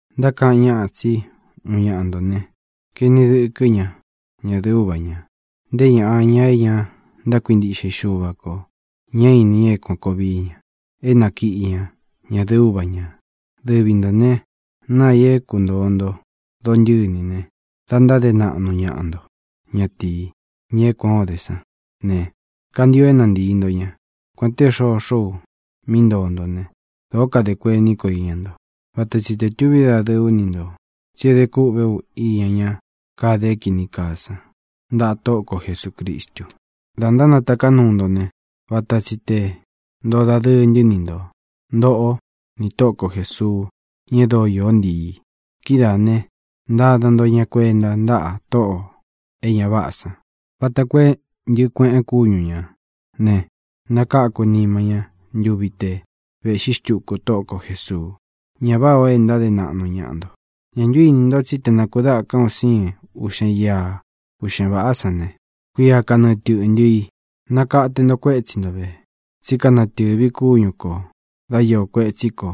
Ntákaꞌan ñáꞌa tsí uun ñaꞌa ntō ne, kaeni dɨkɨ́ ña ñadɨ̄ꞌɨ úva ñā. Nté ñaꞌa, ña é ña ntákuintiꞌxe i Xuva kō, ñá īni ña é kuān koo vií ña, é nákiꞌí ña ñadɨ̄ꞌɨ úva ñā. Dɨvi ntō ne, naa i é kuntōo nto dontɨ́ni ne, da ntáde naꞌnu ñaꞌa nto. Ña tii, ña é kuān ó de sán ne, kantio é nantīi nto ña. Kuān té xoxó u mí ntoo ntó ne, dōó kadē kuení ko iña nto. Vata tsi tē tuví dadɨɨ ú ni ntō, tsí é de kúꞌve ú iña ña kade é kīni kaa san, ntaꞌa Tóꞌo ko Jesūcristu. Dā ntánataká nuu nto ne, vata tsi tē ntoo dadɨɨ ntɨ́ ni nto, ntōꞌó nī Tóꞌo ko Jēsuu, ña e dóo iō ntií i. Kidáā ne, ntáda nto ña kuenta ntáꞌa tóꞌō e ña váꞌā sán vata koo é ntɨ̄ꞌɨ kueꞌen kúñu ñā ne, nakáku nima ña ntuvi te vēꞌxí xtuku Tóꞌo ko Jēsuu. Ñá vāꞌá o é ntáde naꞌnu ñaꞌa nto. ¿Ñā ntu íni nto tsí te nākudáka un síin uꞌxen ia uꞌxen vāꞌá san ne, kuia kanɨɨ tɨꞌntɨ ī? Nakate nto kuétsi nto vē, tsí kanatɨ́vī kúñu kō dá iō kuetsí ko,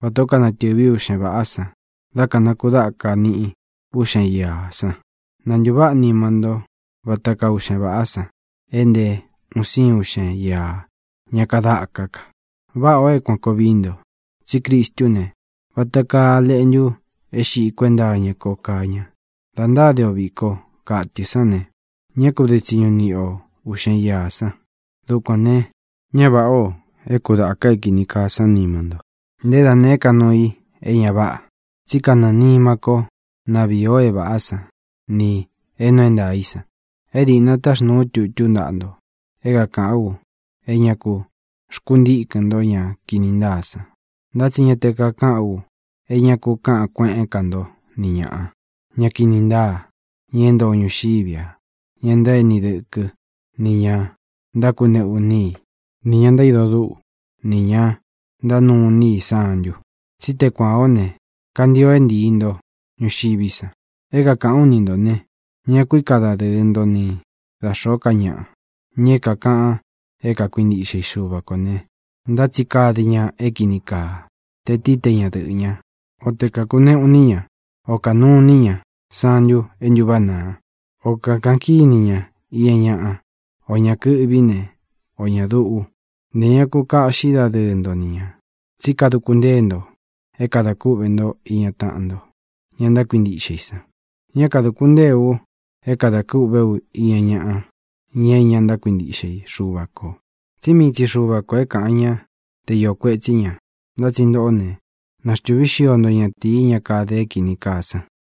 vatā ó kanatɨ́vi uꞌxen vāꞌá san dá kanakudáka niꞌi uꞌxen iā san. Na ntūváꞌa nima nto váta kaa uꞌxen vāꞌá san e nté un síin uꞌxen ia ña kadáká ka. Váꞌā o é kuān koo vií nto, tsí Cristú ne, vata kaa a leꞌntu é xiꞌí kuenta iña ko kaa ña. Dā ntáde o viko katɨ sán ne, ñá ku de tsiñu niꞌi o uꞌxen iā san. Dukuān ne, ña váꞌā o é kudāka é kīni kaa sán nima nto, nté da nēé ka nuu i é ña váꞌa. Tsí kanɨɨ̄ nima kó na vīi o é vāꞌá san nī é nuu é ntaā í san. E díꞌna taxnūu ú tutú ntaꞌa nto é kākaꞌán u é ña ku xkuntíkɨn nto ña kini ntáa san. Ntá tsi ñá te kakaꞌán u é ña ku káꞌan kueꞌén ka ntó ni ñāꞌa, ña kini ntáa, ña é ntoo ñuxiví a, ña ntaéni dɨkɨ́, nī ña ntákuneꞌu iní i, nī ña ntaído dúꞌu, nī ña ntánuu iní i santu, tsí te kuān ó ne, kantio é ntīi nto ñuxiví san. É kākaꞌán u ni ntō ne: Ñá ku ika dadɨɨ nto ni da xōó ka ñaꞌa, ña é kākaꞌan é kakuintiꞌxe i Xuva kō ne, ntá tsi kade ña é kīni kaa, te tií, te ñadɨꞌɨ̄ ñá, o tē kakuneꞌu iní ña, o kānuu iní ña santu é ntúváꞌa naa, o kākaꞌan kíni ña iña ñaꞌa, ō ña kɨꞌví ne, ō ña duꞌu. Ntē ña ku kaꞌxí dadɨɨ nto ni ñā. Tsí kaduku ntée nto é kadā kúꞌvē ntó iña taꞌan nto, ña ntákuintiꞌxe i san. Ñá kadūku ntée u é kadā kûꞌvé u iña ñaꞌa, ña é ña ntákuintiꞌxe i Xuva kō, tsí mii tsi Xuva kō é kāꞌan ñá te iō kuetsí ña. Ntá tsi ntoꞌó ne, naxtuvi xio nto ñatīí, ña kade é kīni kaa san.